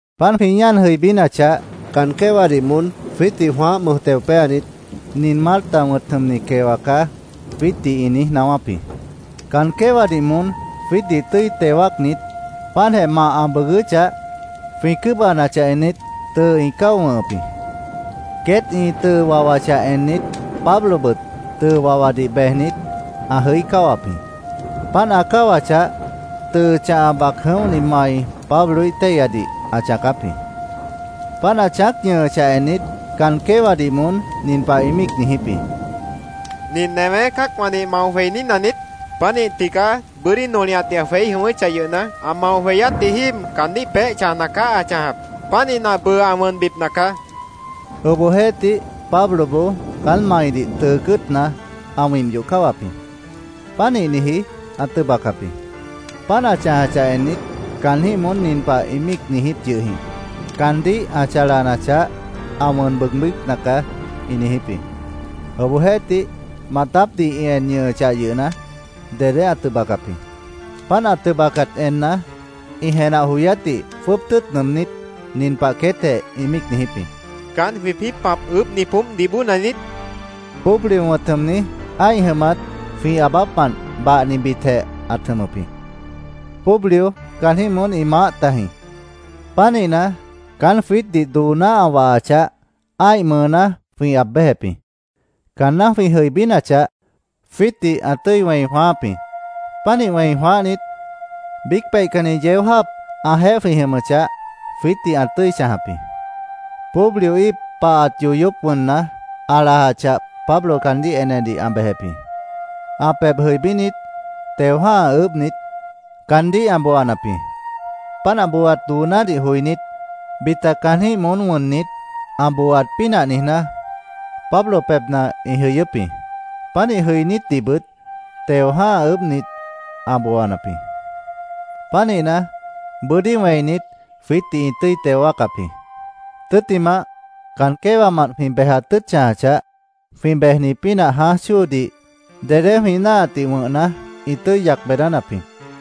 Páant jwĩ ñáan jʉibínachah, caan quéwadih moón jwiítdih jwãáh mʉj teo péanit, “Nin Malta wʉ̃t jʉmni quewa caá”, jwiítdih ĩ niíj naáwáp jĩ. Caan quéwadih moón jwiítdih tʉ́i teo wáacnit, páantjeh mah ã bʉʉgʉ́chah, jwĩ cʉ́bʉhanachah ennit, ĩ tʉʉ cáo wʉ̃hʉp jĩ. Queét ĩ tʉʉ wawachah ennit, Pablobʉt tʉʉ wawadih bejnit, ã jʉí cáwap jĩ. Páant ã cáwachah, tʉʉ chãha bac jʉ̃óhni mai Pabloíh téihyadih ã chãacáp jĩ. Páant ã chãác ñʉhʉchah ennit, caan quéwadih moón nin pah ĩ míic niijíp jĩ: “¿Nin newé cã́acwãdih mao jweiní naniít? Pánih tigaá bʉ́dí nolihatdih ã jweí jʉ̃ʉ́wʉ́chah yʉhna, ã mao jweyátji jíib caandíh peéh chãjna caá ã chãjap. Pánihna, bʉʉ ã wʉnbipna caá”, ĩ míic niijíp jĩ. Obohjeéhtih, Pabloboó caán maidih tʉʉ cʉ́ʉtna ã wimp yoh cáwap jĩ. Pánihniji ã tʉbacap jĩ. Páant ã chãjachah ennit, caanjĩ́h moón nin pah ĩ míic niijíp yʉh jĩ: “Caandíh ã chalanachah, ã wʉn bʉʉgbípna caá”, ĩ niijíp jĩ. Obohjeéhtih, maatápdih ĩ en ñʉhʉchah yʉhna, dedé ã tʉbacap jĩ. Páant ã tʉbacat enna, ĩ jenah joyátdih jwʉ́ʉb tʉ́ʉt nʉʉmnít, nin pah queétjeh ĩ míic niijíp jĩ: “¿Caán jwĩpĩ́ pãp ʉʉ́bhni poómpdih bóona niít?” ĩ niijíp jĩ. Publio wʉ̃t jʉmni, ã́ih jʉmat jwĩ aabápmant bahnibitjeh ãt jʉmʉp jĩ. Publio caanjĩ́h moón ĩ maáh tajĩ. Pánihna, caán jwiítdih dooná ã wahachah, ã́ih mʉʉná jwĩ aab béjep jĩ. Caanná jwĩ jʉibínachah, jwiítdih ã tʉ́i wẽi jwãááp jĩ. Pánih wẽi jwãáhnit, biíc peihcanni yeó jáap ãjeéh jwĩ jʉmʉchah, jwiítdih ã tʉ́i chãjap jĩ. Publio íip pahat yoyóp wʉnna, ã lajachah, Pablo caandíh enedih ã bejep jĩ. Ã pebh jʉibínit, teo jã́ha ʉʉ́bhnit, caandíh ã booanap jĩ. Páant ã booaat doonádih joinít, bita caanjĩ́h moón wʉnnit, ã booaat pínah niijná, Pablo pebhna ĩ jʉyʉ́p jĩ. Pánih jʉinítdihbʉt teo jã́ha ʉʉ́bhnit, ã booanap jĩ. Pánihna, bʉ́dí wẽinit, jwiítdih ĩ tʉ́i teo wáacap jĩ. Tʉ́ttimah, caan quéwamant jwĩ bejat tʉ́ʉt chãjachah, jwĩ bejni pínah jãáj chóodih dedé jwĩ náahatdih wʉ̃hna, ĩ tʉ́i yac beedánap jĩ.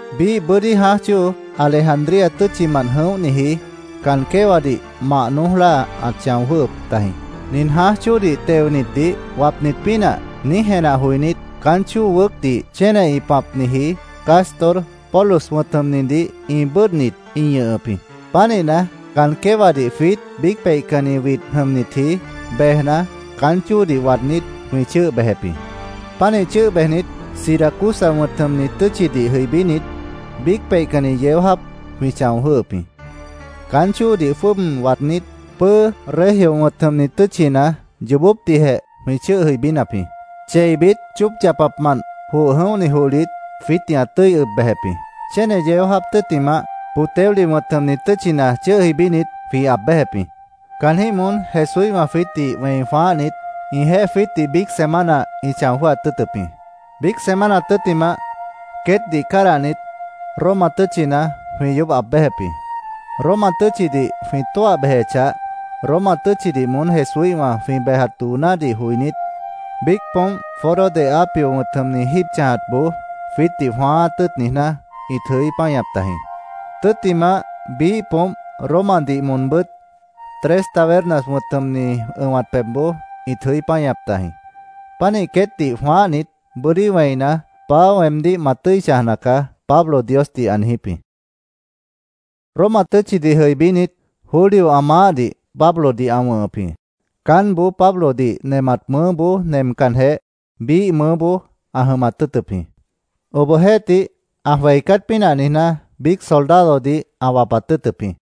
Biíh bʉ́dí jãáj chóo Alejandría tʉ́tchimant jʉ̃óhniji caan quéwadih mah noój láa ãt chão jwʉ́hʉp tajĩ. “Nin jãáj chóodih teonitdih wapnit pínah”, niíj jenah joinít, caán chóo wʉʉ́cdih chéne ĩ pãpniji Cástor, Pólux wʉ̃t jʉmnidih ĩ bʉ́ʉdhnit ĩ ñʉhʉp jĩ. Pánihna, caan quéwadih jwiít biíc peihcanni widh jʉmnitji, bejna, caán chóodih waadnít, jwĩ chʉ́ʉh bejep jĩ. Pánih chʉ́ʉh bejnit, Siracusa wʉ̃t jʉmni tʉ́tchidih jʉibínit, biíc peihcanni yeó jáap jwĩ chão jwʉ́hʉp jĩ. Caán chóodih jwʉ́ʉb waadnít, pʉ́ʉ́ Regio wʉ̃t jʉmni tʉ́tchina yoobópdihjeh jwĩ chʉ́ʉh jʉibínap jĩ. Cheibit chóop yapapmant joh jʉ̃óhni johlit jwiítdih ã tʉ́i ʉb bejep jĩ. Chéne yeó jáap tʉ́ttimah, Puteoli wʉ̃t jʉmni tʉ́tchina chʉ́ʉh jʉibínit, jwĩ aab béjep jĩ. Caanjĩ́h moón Jesúíhwã jwiítdih wẽi jwãáhnit, ĩjeéh jwiítdih biíc semana ĩ chão jwʉ́hat tʉ́ʉtʉp jĩ. Biíc semana tʉ́ttimah queétdih cádahnit, Roma tʉ́tchina jwĩ yoób aab béjep jĩ. Roma tʉ́tchidih jwĩ tóah bejechah, Roma tʉ́tchidih moón Jesúíhwã jwĩ bejat doonádih joinít, biíc poómp Foro de Apio wʉ̃t jʉmni jíib chãjatboó jwiítdih jwãáát tʉ́ʉt niijná, ĩt jʉí páñap tajĩ. Tʉ́ttimah, biíh poómp Romadih moonbʉ́t Tres Tabernas wʉ̃t jʉmni ʉ̃wat pebhboó ĩt jʉí páñap tajĩ. Pánih queétdih jwãáhnit, bʉ́dí wẽina, “Paá, weemdíh ma tʉ́i chãjna caá”, Pablo Diosdih ã niijíp jĩ. Roma tʉ́tchidih jʉibínit, Julio ã maáhdih Pablodih ã wʉ̃hʉp jĩ. Caánboó Pablodih nemat mʉʉ́boó nemcanjeh, biíh mʉʉ́boó ã jʉmat tʉ́ʉtʉp jĩ. Obohjeéhtih, ã jweicát pínah niijná, biíc soldadodih ã wapat tʉ́ʉtʉp jĩ.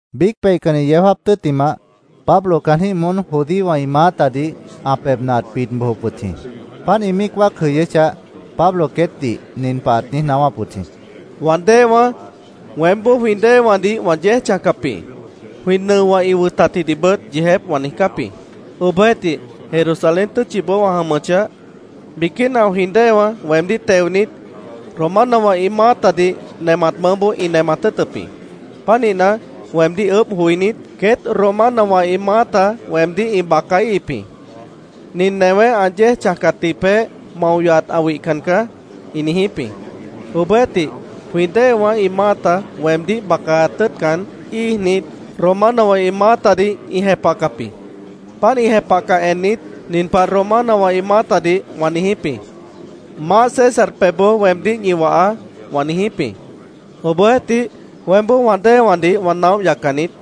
Biíc peihcanni yeó jáap tʉ́ttimah, Pablo caanjĩ́h moón judíowã ĩ maátadih ã pebhna ãt bid bojop wʉt jĩ. Páant ĩ míic wáac jʉyʉ́chah, Pablo queétdih nin pah ãt niíj naáwáp wʉt jĩ: —Wã déewãá, weémboó jwĩ déewãdih wã yéej chãjcap jĩ. Jwĩ nʉowã ĩ wʉtatjidihbʉt yeejép wã niijcáp jĩ. Obohjeéhtih, Jerusalén tʉ́tchiboó wã jʉmʉchah, biquína jwĩ déewã weemdíh teonit, Romanowã ĩ maátadih nemat mʉʉ́boó ĩ nemat tʉ́ʉtʉp jĩ. Pánihna, weemdíh ʉʉ́bh joinít, queét Romanowã ĩ maáta weemdíh ĩ bacaíhip jĩ. “Nin newé ã yéej chãjatji peéh mao yohat ã wihcan caá”, ĩ niijíp jĩ. Obohjeéhtih, jwĩ déewã ĩ maáta weemdíh bacaat tʉ́ʉtcan, íijnit, Romanowã ĩ maátadih ĩ jepahcap jĩ. Páant ĩ jepahcah ennit, nin pah Romanowã ĩ maátadih wã niijíp jĩ: “Maáh César pebhboó weemdíh ñi wahaá”, wã niijíp jĩ. Obohjeéhtih, weémboó wã déewãdih wã naóh yaccan niít.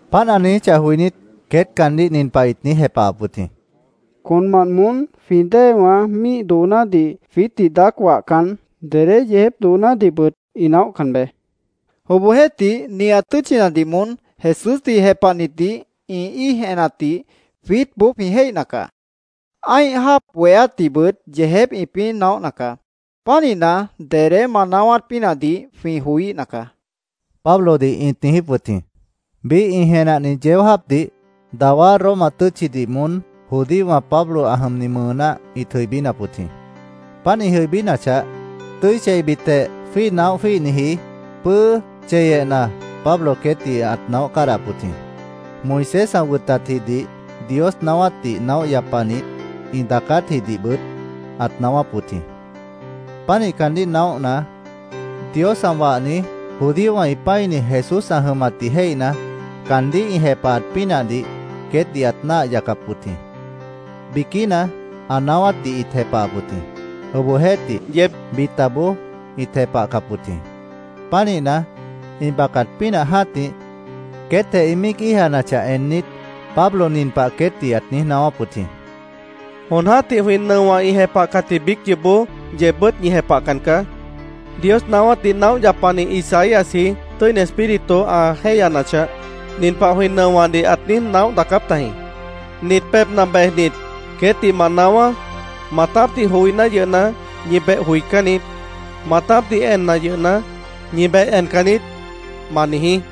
Páant ã niijíchah joinít, queét caandíh nin pah ĩt niíj jepahap wʉt jĩ: —Conmant moón jwĩ déewã míih doonádih jwiítdih daác wahcan, dedé yeejép doonádihbʉt ĩ naóhcan be. Obohjeéhtih, nihat tʉ́tchinadih moón Jesúsdih jepahnitdih ĩ íij enatdih jwiítboó jwĩ jéihna caá. Ã́ih jáap bohéátdihbʉt yeejép ĩpĩ́ naóhna caá. Pánihna, dedé ma naáwát pínahdih jwĩ joííhna caá, Pablodih ĩt niijíp wʉt jĩ. Biíh ĩ jenahni yeó jáapdih dawá Roma tʉ́tchidih moón judíowã Pablo ã jʉmni mʉʉná ĩt jʉibínap wʉt jĩ. Páant ĩ jʉibínachah, tʉ́i cheibitjeh jwíih naóh jwíihniji pʉ́ʉ́ cheyehna Pablo queétdih ãt naóh cádahap wʉt jĩ. Moisés ã wʉtatjidih, Dios naáwátdih naóh yapanit ĩ daacátjidihbʉt ãt naáwáp wʉt jĩ. Pánih caandíh naóhna, Dios ã wahni, judíowã ĩ pã́ini Jesús ã jʉmatdih jéihna, caandíh ĩ jepahat pínahdih queétdih ãt náah yacap wʉt jĩ. Biquína ã naáwátdih ĩt jepahap wʉt jĩ. Obohjeéhtih, bitaboó ĩt jepahcap wʉt jĩ. Pánihna, ĩ bacat pínah jã́tih, queétjeh ĩ míic íijanachah ennit, Pablo nin pah queétdih ãt niíj naáwáp wʉt jĩ: —Jon jã́tih jwĩ nʉowã ĩ jepahcatji biíc yoobó yeebbʉ́t ñi jepahcan caá. Dios naáwátdih naóh yapani Isaíasji, Tʉ́ini Espíritu ã jéihyanachah, nin pah jwĩ nʉowãdih ãt niíj naóh daacáp tajĩ: ‘Nit pebhna bejnit, queétdih ma naáwá: “Maatápdih joiná yʉhna, ñi beh joicán niít. Maatápdih enna yʉhna, ñi beh encan niít”, ma niijí.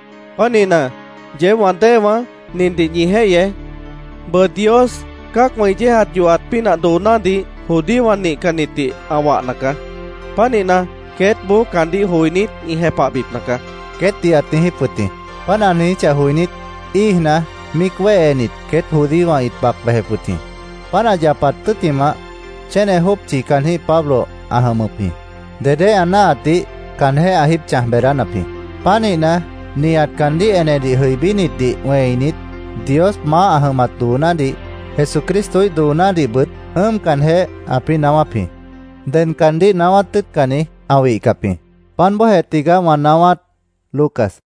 Pánihna, yeéb wã déewãá, nindih ñi jéihyeé. Bʉʉ Dios cã́acwã ĩ yéejat yohat pínah doonádih judíowã nihcannitdih ã wahna caá. Pánihna, queétboó caandíh joinít, ĩ jepahbipna caá, queétdih ãt niijíp wʉt jĩ. Páant ã niijíchah joinít, íijna, míic wéhenit, queét judíowã ĩt bac bejep wʉt jĩ. Páant ã yapat tʉ́ttimah, chéne jópchi caanjĩ́h Pablo ã jʉmʉp jĩ. Dedé ã náahatnadih caanjéh ã jíib chãj beedánap jĩ. Pánihna, nihat caandíh enedih jʉibínitdih wẽinit, Dios maáh ã jʉmat doonádih, Jesucristoíh doonádihbʉt ʉ́ʉmcanjeh, ãpĩ́ naáwáp jĩ. Ded caandíh naáwát tʉ́ʉtcanni ã wihcap jĩ. Páant bóojeh tigaá wã naáwát. Lucas